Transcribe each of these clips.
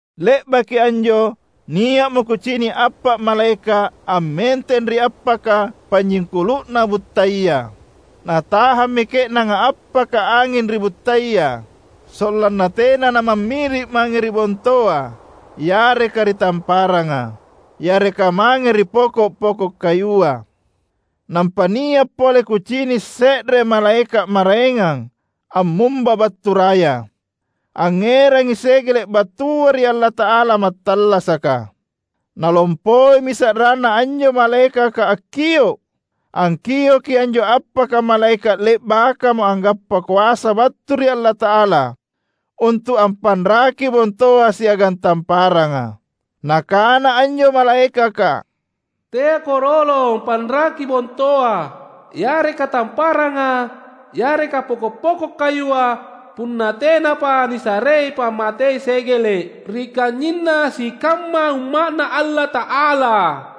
Le’baki anjo, nia’mo kucini’ appa’ malaeka’ ammenteng ri appaka panyingkulu’na buttaya. Natahammi ke’nanga appaka anging ri buttaya sollanna tena namammiri’ mange ri bontoa, yareka ri tamparanga, yareka mange ri poko’-poko’ kayua. Nampa nia’ pole kucini’ se’re malaeka’ maraengang ammumba battu raya. Angngerangi segele’ battua ri Allata’ala Mattallasaka. Nalompoimi sa’ranna anjo malaekaka akkio’, angkioki anjo appaka malaeka’ le’bakamo anggappa koasa battu ri Allata’ala untu’ ampanraki bontoa siagang tamparanga. Nakana anjo malaekaka, "Teako rolong panraki bontoa, yareka tamparanga yareka poko’-poko’ kayua punna tenapa nisarei pammatei segele’ ri kanynyinna sikamma Umma’Na Allata’ala."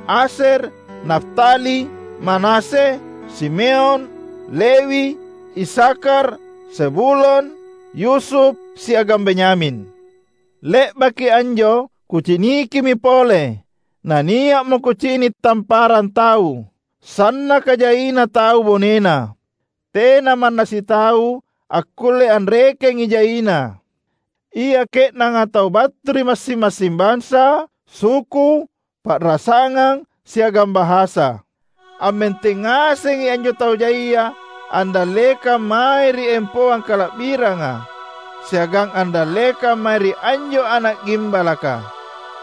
Asyer, Naftali, Manasye, Simeon, Lewi, Isakhar, Zebulon, Yusuf, siagang Benyamin. Le’baki anjo kucinikimi pole, na nia’mo kucini’ tamparang tau, sannaka jaina tau bonena; tena manna sitau akkulle anrekengi jaina! Ia ke’nanga tau battu ri massing-massing bansa, suku, pa’rasangang, siagang bahasa. Ammenteng ngasengi anjo tau jaia andallekang mae ri empoang kala’biranga siagang andallekang mae ri anjo Ana’ Gimbalaka;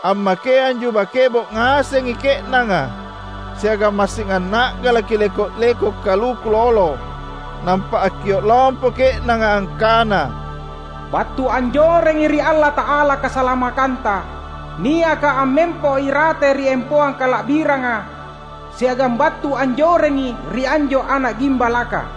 ammakeang juba kebo’ ngasengi ke’nanga siagang massing anna’galaki leko’-leko’ kaluku lolo. Nampa akkio’ lompo ke’nanga angkana, "Battu anjorengi ri Allata’ala kasalamakkanta, niaka ammempo irate ri empoang kala’biranga, siagang battu anjorengi ri anjo Ana’ Gimbalaka!"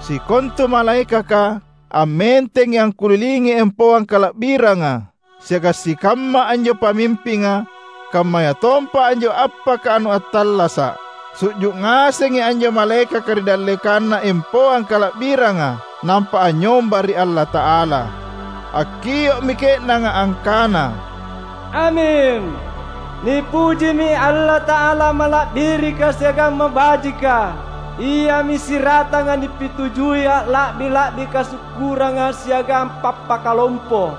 Sikontu malaekaka ammentengi angkulilingi empoang kala’biranga siagang sikamma anjo pamimpinga, kammayatompa anjo appaka anu attallasa’. Su’ju’ ngasengi anjo malaekaka ri dallekanna empoang kala’biranga nampa anynyomba ri Allata’ala. Akkio’mi ke’nanga angkana, "Aming! Nipujimi Allata’ala Mala’birika siagang Mabajika. Iami siratanga nipitujui alla’bi-la’bi kasukkurang siagang pappakalompo.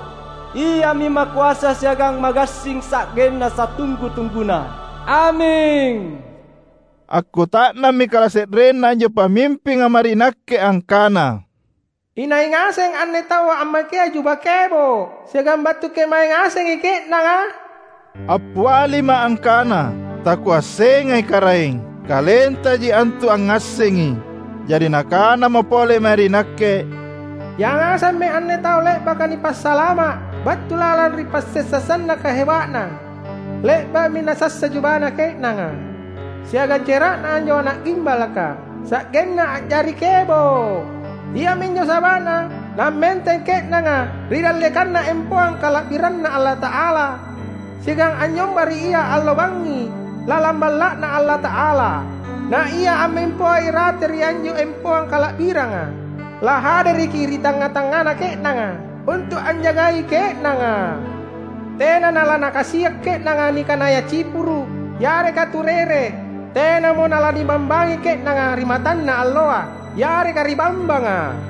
Iami makoasa siagang magassing sa’genna satunggu-tungguna! Aming." Akkuta’nammi kalase’renna anjo pamimpinga mae ri nakke angkana, "Inai ngaseng anne tau ammakea juba kebo’ siagang battu kemae ngasengi ke’nanga?" Appialima’ angkana, "Takuassengai Karaeng. KalenTaji antu angngassengi." Jari nakanamo pole mae ri nakke, "Yangasemmi anne tau le’baka nipasalama’ battu lalang ri passessa sannaka heba’na. Le’ba’mi nasassa jubana ke’nanga siagang cera’Na anjo Ana’ Gimbalaka sa’genna a’jari kebo’. Iaminjo saba’na nammenteng ke’nanga ri dallekanna empoang kala’biranNa Allata’ala, siagang anynyomba ri Ia allo bangngi lalang Balla’Na Allata’ala. Na Ia ammempoa irate ri anjo empoang kala’biranga lahadereki ri tangnga-tangngana ke’nanga untu’ anjagai ke’nanga. Tena nalanakasia’ ke’nanga nikanaya cipuru’ yareka turere; tenamo nalanibambangi ke’nanga ri matanna alloa yareka ri bambanga;